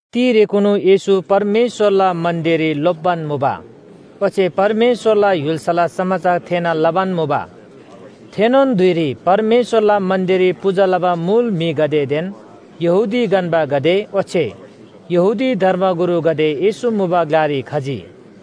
तिरेकुनु येशू परमेश्‍वरला मन्‍दिररी लोप्‍बान मुबा ओच्‍छे परमेश्‍वरला य्‍हुल्‍साला समाचार थेःना लबान मुबा। थेनोन धुइरी परमेश्‍वरला मन्‍दिररी पूजा लबा मुल म्‍हिगदेदेन यहूदी गन्‍बागदे ओच्‍छे यहूदी धर्मगुरुगदे येशू मुबा ग्‍लारी खजी।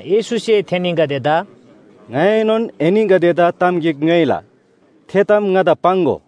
येशूसे थेनीगदेदा “ङाइएनोन एनीगदेदा ताम गिक ङ्‌योइला, थे ताम ङादा पाङ्‍गो।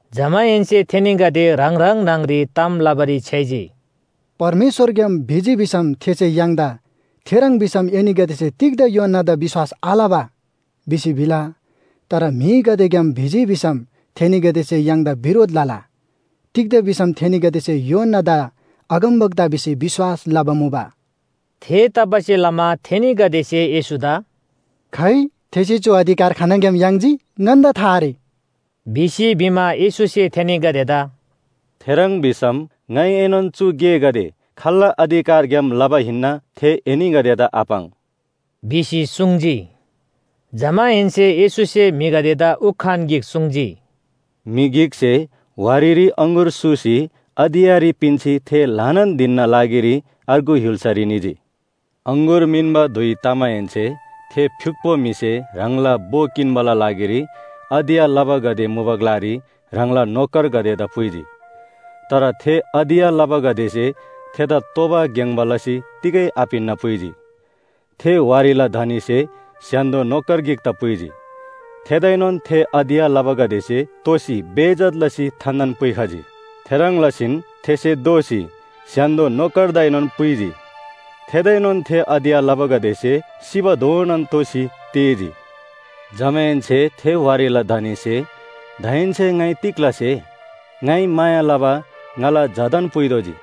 जमाहेन्‍से थेनीगदे ह्राङ ह्राङ न्‍हङरी ताम लबारी छ्‌याइजी, “परमेश्‍वरग्‍याम भिजी भिसम थेसे य्‍हाङदा ‘थेह्रङ् भिसम एनीगदेसे तिग्‍दा यूहन्‍नादा विश्‍वास आलबा?’ भिसी भिला। तर म्‍हिगदेग्‍याम भिजी भिसम म्‍हिगदेसे य्‍हाङदा बिरोध लला। तिग्‍दा भिसम थेनीगदेसे यूहन्‍नादा अगमवक्ता भिसी विश्‍वास लबा मुबा।” थेतबासेलमा थेनीगदेसे येशूदा “खाइ, थेसे चु अधिकार खानङग्‍याम याङ्जी ङन्‍दा था आरे” भिसी भिमा, येशूसे थेनीगदेदा “थेह्रङ् भिसम ङाइएनोन चु गेगदे खाल्‍ला अधिकारग्‍याम लबा हिन्‍ना, थे एनीगदेदा आपाङ्” भिसी सुङ्जी। जमाहेन्‍से येशूसे म्‍हिगदेदा उखान गिक सुङ्जी, “म्‍हि गिकसे वारीरी अङगुर सूसी अधियाँरी पिन्‍सी थे ल्‍हानान धिनना लागिरी अर्गु य्‍हुल्‍सारी निजी। अङगुर मिन्‍बा धुइ तमाहेन्‍से थे फ्‍युक्‍पो म्‍हिसे ह्राङला भो किन्‍बाला लागिरी अधियाँ लबागदे मुबा ग्‍लारी ह्राङला नोकरगदेदा पुइजी। तर थे अधियाँ लबागदेसे थेदा तोबा ग्‍याङ्‍बा लसी तिगै आपिन्‍ना पुइजी। थे वारीला धनीसे स्‍य्‍हान्‍दो नोकर गिकदा पुइजी। थेदाएनोन थे अधियाँ लबागदेसे तोसी बेइज्‍जत लसी थान्‍थान पुइखजी। थेह्रङ् लसीन थेसे दोःसी स्‍य्‍हान्‍दो नोकरदाएनोन पुइजी थेदाएनोन थे अधियाँ लबागदेसे सिबाधोनान तोसी तेःजी। “जमाहेन्‍से थे वारीला धनीसे ‘दाहेन्‍से ङाइ तिग लसे? ङाइ माया लबा ङाला झादान पुइतोःजी।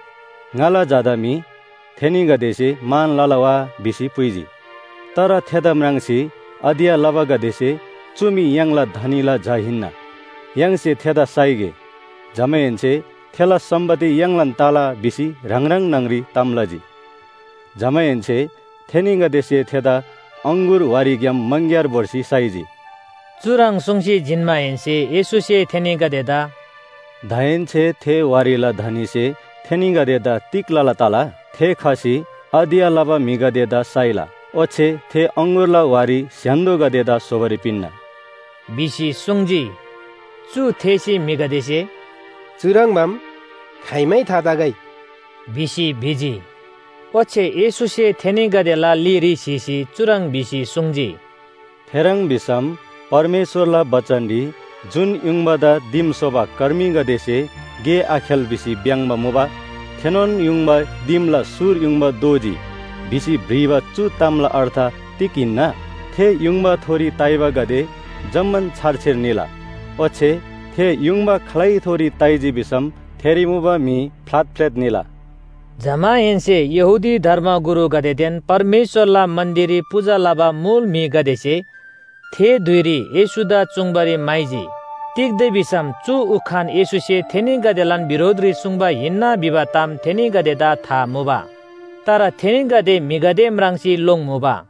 ङाला झादा मी थेनीगदेसे मान लला वा?’ भिसी पुइजी। तर थेदा म्राङ्सी अधियाँ लबागदेसे ‘चु मी य्‍हाङला धनीला झा हिन्‍ना, य्‍हाङसे थेदा साइगे। जमाहेन्‍से थेला सम्‍पत्ति य्‍हाङलान तला’ भिसी ह्राङ ह्राङ न्‍हङरी ताम लजी। जमाहेन्‍से थेनीगदेसे थेदा अङगुर वारीग्‍याम मङग्‍यार भोर्सी साइजी।” चुह्रङ् सुङ्सी जिन्‍माहेन्‍से येशूसे थेनीगदेदा “दाहेन्‍से थे वारीला धनीसे थेनीगदेदा तिग लला तला? थे खसी अधियाँ लबा म्‍हिगदेदा साइला ओच्‍छे थे अङगुरला वारी स्‍य्‍हान्‍दोगदेदा स्‍होबारी पिन्‍ना।” भिसी सुङ्जी। चु थेःसी म्‍हिगदेसे “चुह्रङ्बाम खाइमै थातगै” भिसी भिजी। ओच्‍छे येशूसे थेनीगदेला लीरी स्‍हीसी चुह्रङ् भिसी सुङ्जी, “थेह्रङ् भिसम परमेश्‍वरला बचनरी ‘जुन युङबादा दिम स्‍होबा कर्मीगदेसे गे आखेल भिसी भ्‍याङ्‍बा मुबा थेनोन युङबा दिमला सुर युङबा दोजी’ भिसी भ्रिबा चु तामला अर्थ तिग हिन्‍ना? थे युङबाथोरी ताइबागदे जम्‍मान छारछिर निला, ओच्‍छे थे युङबा खालैथोरी ताइजी भिसम थेरी मुबा म्‍हि फ्‍लातफ्‍लेत निला।” जमाहेन्‍से यहूदी धर्मगुरुगदेदेन परमेश्‍वरला मन्‍दिररी पूजा लबा मुल म्‍हिगदेसे थे धुइरी येशूदा चुङ्बारी म्‍हाइजी। तिग्‍दा भिसम चु उखान येशूसे थेनीगदेलान बिरोधरी सुङ्बा हिन्‍ना भिबा ताम थेनीगदेदा था मुबा। तर थेनीगदे म्‍हिगदे म्राङ्सी लोङ्मुबा।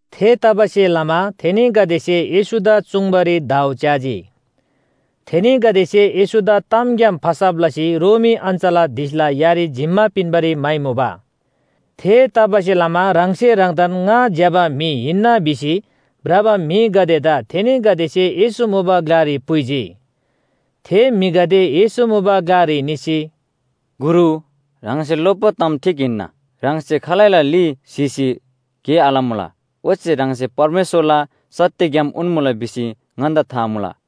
थेतबासेलमा थेनीगदेसे येशूदा चुङ्बारी दाउ च्‍याजी। थेनीगदेसे येशूदा तामग्‍याम फसब लसी रोमी अञ्‍चलाधीशला यारी जिम्‍मा पिन्‍बारी म्‍हाइमुबा। थेतबासेलमा ह्राङसे ह्राङदान ङा ज्‍यबा म्‍हि हिन्‍ना भिसी भ्रबा म्‍हिगदेदा थेनीगदेसे येशू मुबा ग्‍लारी पुइजी। थे म्‍हिगदे येशू मुबा ग्‍लारी निसी, “गुरु, ह्राङसे लोप्‍बा ताम ठीक हिन्‍ना। ह्राङसे खालैला ली स्‍हीसी गे आलमुला, ओच्‍छे ह्राङसे परमेश्‍वरला सत्‍य ग्‍याम उन्‍मुला भिसी ङन्‍दा था मुला।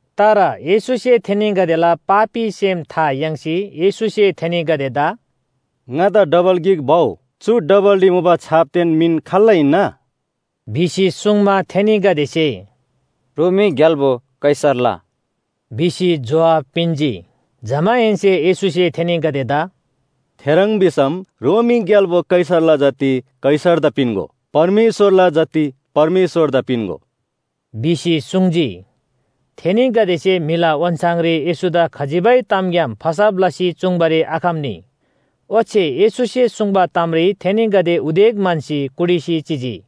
तर येशूसे थेनीगदेला पापी सेम था याङ्सी येशूसे थेनीगदेदा “ङादा डबल गिक भउ। चु डबलरी मुबा छापदेन मिन खाल्‍ला हिन्‍ना?” भिसी सुङ्मा, थेनीगदेसे “रोमी ग्‍याल्‍बो कैसरला” भिसी जोहाब पिन्‍जी। जमाहेन्‍से येशूसे थेनीगदेदा “थेह्रङ् भिसम रोमी ग्‍याल्‍बो कैसरला जति कैसरदा पिन्‍गो, परमेश्‍वरला जति परमेश्‍वरदा पिन्‍गो” भिसी सुङ्जी। थेनीगदेसे म्‍हिला ओन्‍छाङरी येशूदा खजिबै तामग्‍याम फसब लसी चुङ्बारी आखम्‍नी। ओच्‍छे येशूसे सुङ्बा तामरी थेनीगदे उदेक म्‍हन्‍सी कुटिसी चिजी।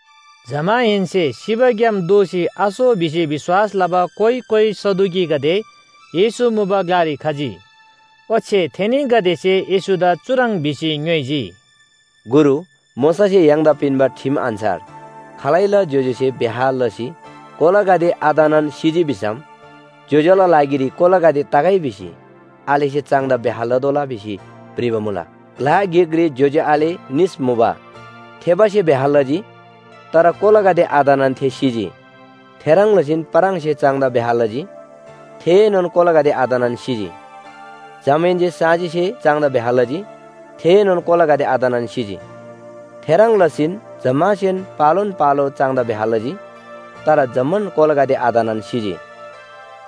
जमाहेन्‍से सिबाग्‍याम दोःसी आसो भिसी विश्‍वास लबा कोइ कोइ सदुकीगदे येशू मुबा ग्‍लारी खजी। ओच्‍छे थेनीगदेसे येशूदा चुह्रङ् भिसी ङ्‌योइजी, “गुरु, मोशासे य्‍हाङदा पिन्‍बा ठिम अन्‍छार खालैला ज्‍योज्‍योसे ब्‍याह लसी कोलागदे आतनान सिजी भिसम ज्‍योज्‍यो‍ला लागिरी कोलागदे तगै भिसी आलेसे चाङदा ब्‍याह लतोःला भिसी भ्रिबा मुला। ग्‍ला गिकरी ज्‍योज्‍यो आले निस मुबा। थेबासे ब्‍याह लजी, तर कोलागदे आतनान थे सिजी। थेह्रङ् लसीन पाराङसे चाङदा ब्‍याह लजी, थेएनोन कोलागदे आतनान सिजी। जमाहेन्‍से साँजीसे चाङदा ब्‍याह लजी, थेएनोन कोलागदे आतनान सिजी। थेह्रङ् लसी जम्‍मासेन पालोन पालो चाङदा ब्‍याह लजी। तर जम्‍मान कोलागदे आतनान सिजी।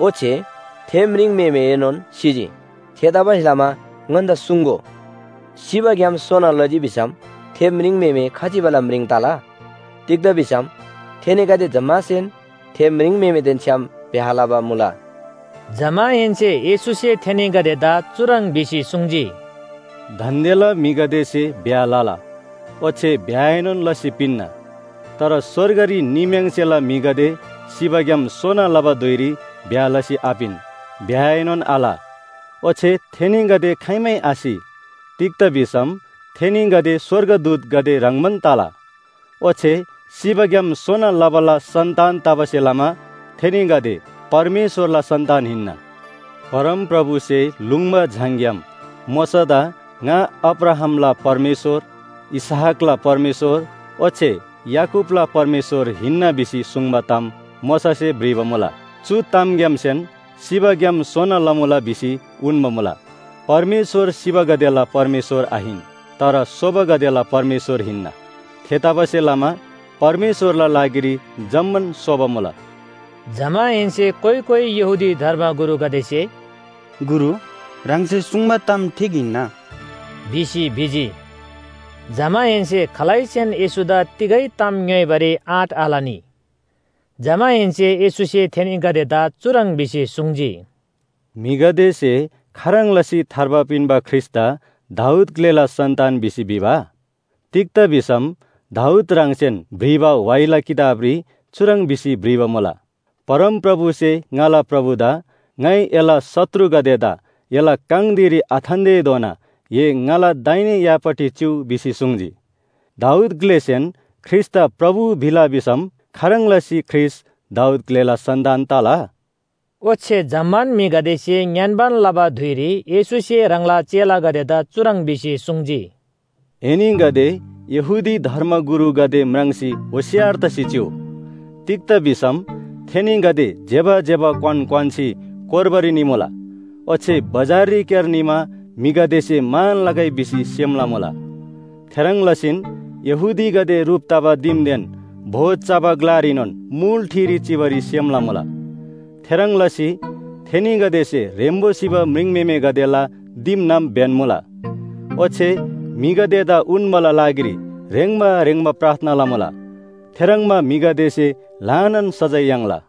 ओच्‍छे थे म्रिङम्‍हेमेएनोन सिजी। थेतबासेलमा ङन्‍दा सुङ्‍गो, सिबाग्‍याम सोना लजी भिसम थे म्रिङम्‍हेमे खजिबाला म्रिङ तला? तिग्‍दा भिसम थेनीगदे जम्‍मासेन थे म्रिङम्‍हेमेदेन छ्‌याम ब्‍याह लबा मुला।” जमाहेन्‍से येशूसे थेनीगदेदा चुह्रङ् भिसी सुङ्जी, “दान्‍देला म्‍हिगदेसे ब्‍याह लला, ओच्‍छे ब्‍याहएनोन लसी पिन्‍ना। तर स्‍वर्गरी निम्‍याङ्सेला म्‍हिगदे सिबाग्‍याम सोना लबा धुइरी ब्‍याह लसी आपिन ब्‍याहएनोन आल। ओच्‍छे थेनीगदे खाइमै आसि तिग्‍दा भिसम थेनीगदे स्‍वर्गदूतगदे ह्रङ्‌बान तला। ओच्‍छे सिबाग्‍याम सोना लबाला सन्‍तान तबासे लमा थेनीगदे परमेश्‍वरला सन्‍तान हिन्‍ना। परमप्रभुसे लुङ्बा झाङग्‍याम मोशादा ‘ङा अब्राहामला परमेश्‍वर, इसहाकला परमेश्‍वर ओच्‍छे याकूबला परमेश्‍वर हिन्‍ना’ भिसी सुङ्बा ताम मोशासे भ्रिबा मुला। चु तामग्‍यामसेन सिबाग्‍याम सोना लमुला भिसी उन्‍बा मुला। परमेश्‍वर सिबागदेला परमेश्‍वर आहिन, तर सोबागदेला परमेश्‍वर हिन्‍ना! थेतबासेलमा परमेश्‍वरला लागिरी जम्‍मान सोबा मुला।” जमाहेन्‍से कोइ कोइ यहूदी धर्मगुरुगदेसे “गुरु, ह्राङसे सुङ्बा ताम ठीक हिन्‍ना” भिसी भिजी। जमाहेन्‍से खालैसेन येशूदा तिगै ताम ङ्‌योइबारी आँट आलनी। जमाहेन्‍से येशूसे थेनीगदेदा चुह्रङ् भिसी सुङ्जी, “म्‍हिगदेसे खाह्रङ् लसी थार्बा पिन्‍बा ख्रीष्‍टदा दाऊद ग्‍लेला सन्‍तान भिसी भिबा? तिग्‍दा भिसम दाऊद ह्राङसेन भ्रिबा व्‍हाइला किताबरी चुह्रङ् भिसी भ्रिबा मुला, ‘परमप्रभुसे ङाला प्रभुदा ङाइ एला शत्रुगदेदा एला काङ धिरी आथान्‍तेधोना ए ङाला दाहिने यापट्टि चिउ भिसी सुङ्जी।’ दाऊद ग्‍लेसेन ख्रीष्‍टदा प्रभु भिला भिसम खाह्रङ् लसी ख्रीष्‍ट दाऊद ग्‍लेला सन्‍तान तला?” ओच्‍छे जम्‍मान म्‍हिगदेसे ङ्‌यान्‍बान लबा धुइरी येशूसे ह्राङला चेलागदेदा चुह्रङ् भिसी सुङ्जी, “एनीगदे यहूदी धर्मगुरुगदे म्राङ्सी होशियार तसी चिउ। तिग्‍दा भिसम थेनीगदे ज्‍यबा ज्‍यबा क्‍वान क्‍वान्‍सी कोर्बारी निमुला, ओच्‍छे बजाररीक्‍यार निमा म्‍हिगदेसे मान लगै भिसी सेम लमुला। थेह्रङ् लसीन यहूदीगदे ह्रुप तबा दिमदेन भोज चबा ग्‍लारीनोन मुल ठिरी चिबारी सेम लमुला। थेह्रङ् लसी थेनीगदेसे ह्रेम्‍बो सिबा म्रिङम्‍हेमेगदेला दिमनाम ब्‍यन्‍मुला ओच्‍छे म्‍हिगदेदा उन्‍बाला लागिरी ह्रेङ्बा ह्रेङ्बा प्रार्थना लमुला। थेह्रङ्बा म्‍हिगदेसे ल्‍हानान सजाय याङ्ला।”